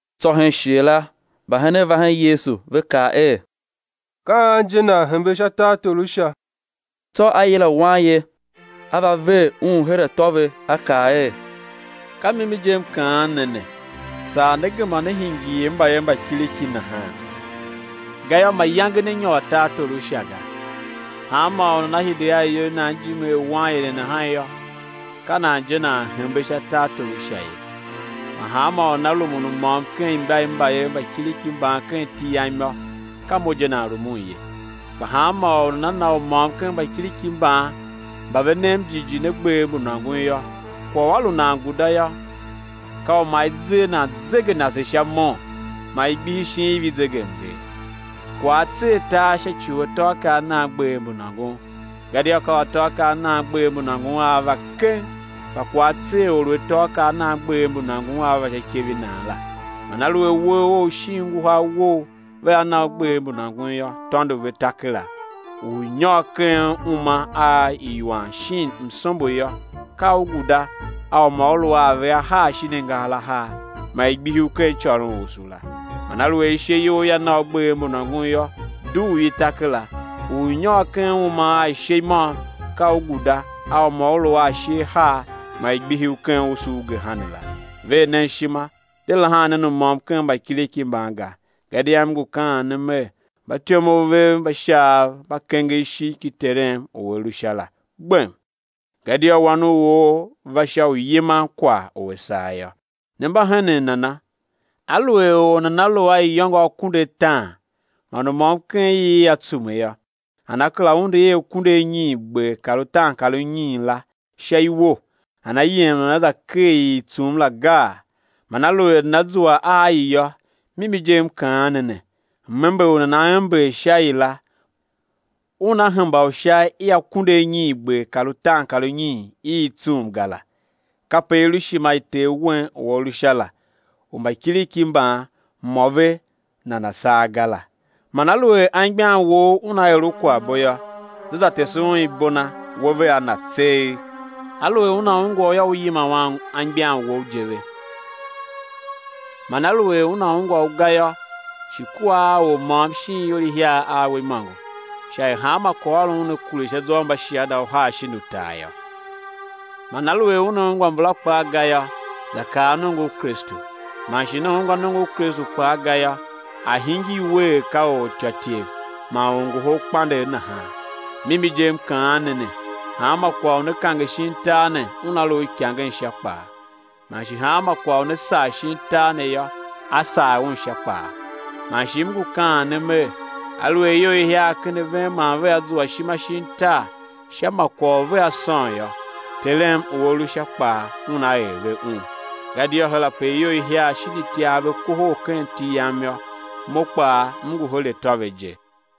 Tsô hen shighe la mbahenen va hen Yesu, ve kaa er: Ka an je nan hembe sha tartor u Sha? Tsô A yila wanye A va ver un her atô ve, A kaa er: Ka mimi je, M kaan ne ne, saa né gema né hingir er mbayev mba kiriki nahan, gayô, mayange né nyôr tartor u Sha ga. Hanmô u nana hide a iyol i nan ijime er wanye ne nahan yô, ka nan je nan hembe sha tartor u Sha ye. Man hanmô u nana rumun u môm ken imba i mbayev mba kiriki mban ken iti Yam yô, ka Mo je nan rumun ye. Kpa hanmô u nana na u môm ken mbakiriki mban mba ve nem jighjigh ne, gbev mbu nôngon yô, kwagh u a lu nan guda yô, ka u ma i zer nan zegenase sha mon, ma i gbihi shin iv i zegemnger. Kwagh á tser tar sha ci u atôakaa a nan gbev mbu nôngon. Gadia ka u atôakaa a nan gbev mbu nôngon a a va keng, kpa kwagh á tser or u atôakaa a nan gbev mbu nôngon a va sha ikev i nan la. Man aluer uwegh ough shin nguhar wou vea na u gbev mbu nôngon yô, tôndo ve, ta kera; u ú nyôr ken uma a iwan shin msombo yô, ka u guda a u ma u lu a ave ahar shin angahar ahar, ma i gbihi u ken icôronusu la. Man aluer ishe you ia na u gbev mbu nôngon yô, dugh i, ta kera, a ú nyôr ken uma a ishe i môm ka u guda a u ma u lu a ashe ahar ma i gbihi u ken usu u gehena la. Ver nen ishima, de lahan nen u môm ken mbakiriki mban ga, gadia M ngu kaan ne Mer, mbatyomov vev mba Shaav mba kenger ishigh ki Terem u A lu sha la gbem. [Gadia Wan u or va sha u yiman kwagh u a saa yô]. Ne mba henen nana? Aluer or nana lu a iyôngo akunduataan man u môm ken i ia tsume yô, nana kera undu i akunduanyiingber kar itiankarinyiin la sha iwo, nana yem nana za ker i i tsum la gaa? Man aluer nana zua a i yô, mimi je M ngu kaan ne, m-ember u nana ember sha i la, una hemba u sha i akunduanyiingber kar itiankarinyiin i i tsum ga la. Kape i lu ishima i Ter wen u A lu Sha la, u mbakiriki mban, mô ve nana saa ga la. Man aluer anmgbian wou una er u kwaghbo yô, za za tese un ibo na, we vea na tseegh; aluer una ungwa u yô, u yima anmgbian wou je ve. Man aluer una ungwa u ga yô, shi kua a or môm shin ior ihiar a we imôngo, sha er hanma kwaghôron una kure sha zwa u mbashiada uhar shin utar yô. Man aluer una ungwa mbala kpaa ga yô, za kaa nongo u Kristu; man shi una ungwa nongo u Kristu kpaa ga yô, a̱ hingir we er ka ortyôtyev man orngoholkpandegh nahan. Mimi je M kaan ne ne, hanma kwagh u ne kange shin tar ne, una lu uikangen Sha kpaa; man shi hanma kwagh u ne sagh shin tar ne yô, á sagh un Sha kpaa. Man shi M ngu kaan ne Mer: Aluer ior ihiar ken a ven man vea zua ishima shin tar sha ma kwagh u vea sôn yô, Terem u A lu Sha kpaa Una er ve un. Gadia her ape ior ihiar shin itiar ve kohol ken iti Yam yô, Mo kpaa M ngu ve her atô je.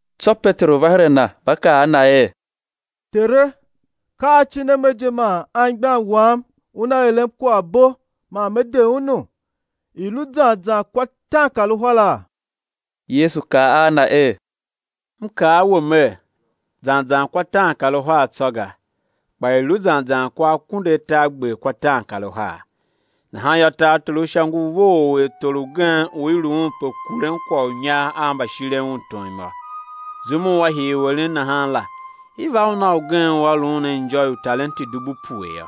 Tsô Peteru va her a Na, va kaa a Na er: Tere, ka acin a me je man anmgbian wam una eren kwaghbo man me de unu? I̱ lu zan zan kwa taankaruhara? Yesu kaa a na er: M kaa a we Mer, zan zan kwa taankaruhar tsô ga, kpa i̱ lu zan zan akunduatargber kwa taankaruhar. Nahan yô, tartor u Sha ngu vough er tor ugen u i lu un pe kuren kwagh u inyar a mbashiren un tom yô. Zum u a hii u eren nahan la, i va un a ugen u a lu un a injô i utalenti dubu pue yô.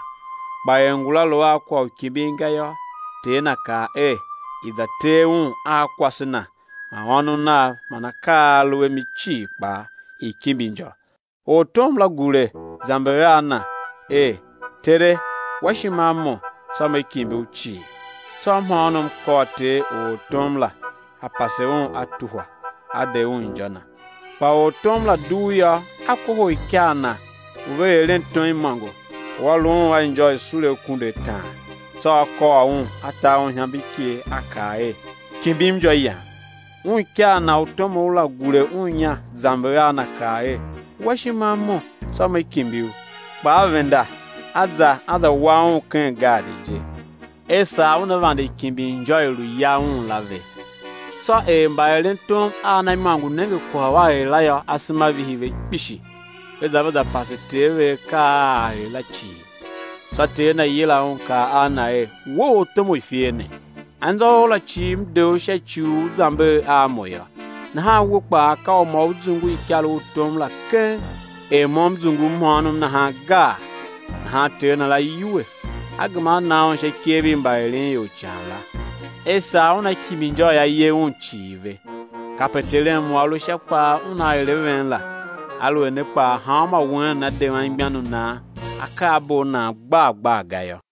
Kpa er ngula lu a kwagh u kimbin ga yô, ter na kaa er, i̱ za tee un a kwase na man ônov nav man akaa a a lu a mi cii kpaa, i̱ kimbi injô. Ortom la gure, zamber a na er: Tere, wa ishima a mo, tsô me kimbi u cii. Tsô mhôônom kôr ter u ortom la, a pase un a tuhwa, a de un injô na. Kpa ortom la dugh yô, a kohol ikar na u ve eren tom imôngo, u a lu un a injô, i sule akunduataan, tsô a kôr un, a ta un ihamber iker, a kaa er: Kimbim injô yam. Un ikar na u tomough la gure un inya, zamber a na kaa er: Wa ishima a mo, tsô me kimbi u. Kpa a venda, a za, a za wa un ken gaadi je, er saa una vande kimbin injô i lu ya un la ve. Tsô er mbaerentom a na imôngo nenge kwagh u a er la yô, asema vihi ve kpishi, ve za, ve za pase ter ve akaa a a er la cii. Tsô ter na yila un, kaa a na er: We ortom u ifer ne, anzô ou la cii m de u sha ci u u zamber a mo yô. Nahan we kpaa, ka u ma u zungu ikaru u tom la keng er mo m zungu u mhôônom nahan gaa? Nahan ter na la yuwe, a gema a na un sha ikev i mbaeren ior ican la, er saa una kimbi injô i a ye un cii ve. Kape Terem u A lu Sha kpaa Una er a ven la, aluer ne kpaa hanmô wen nana de anmgbian u nan akaabo a nan gbar gbar ga yô.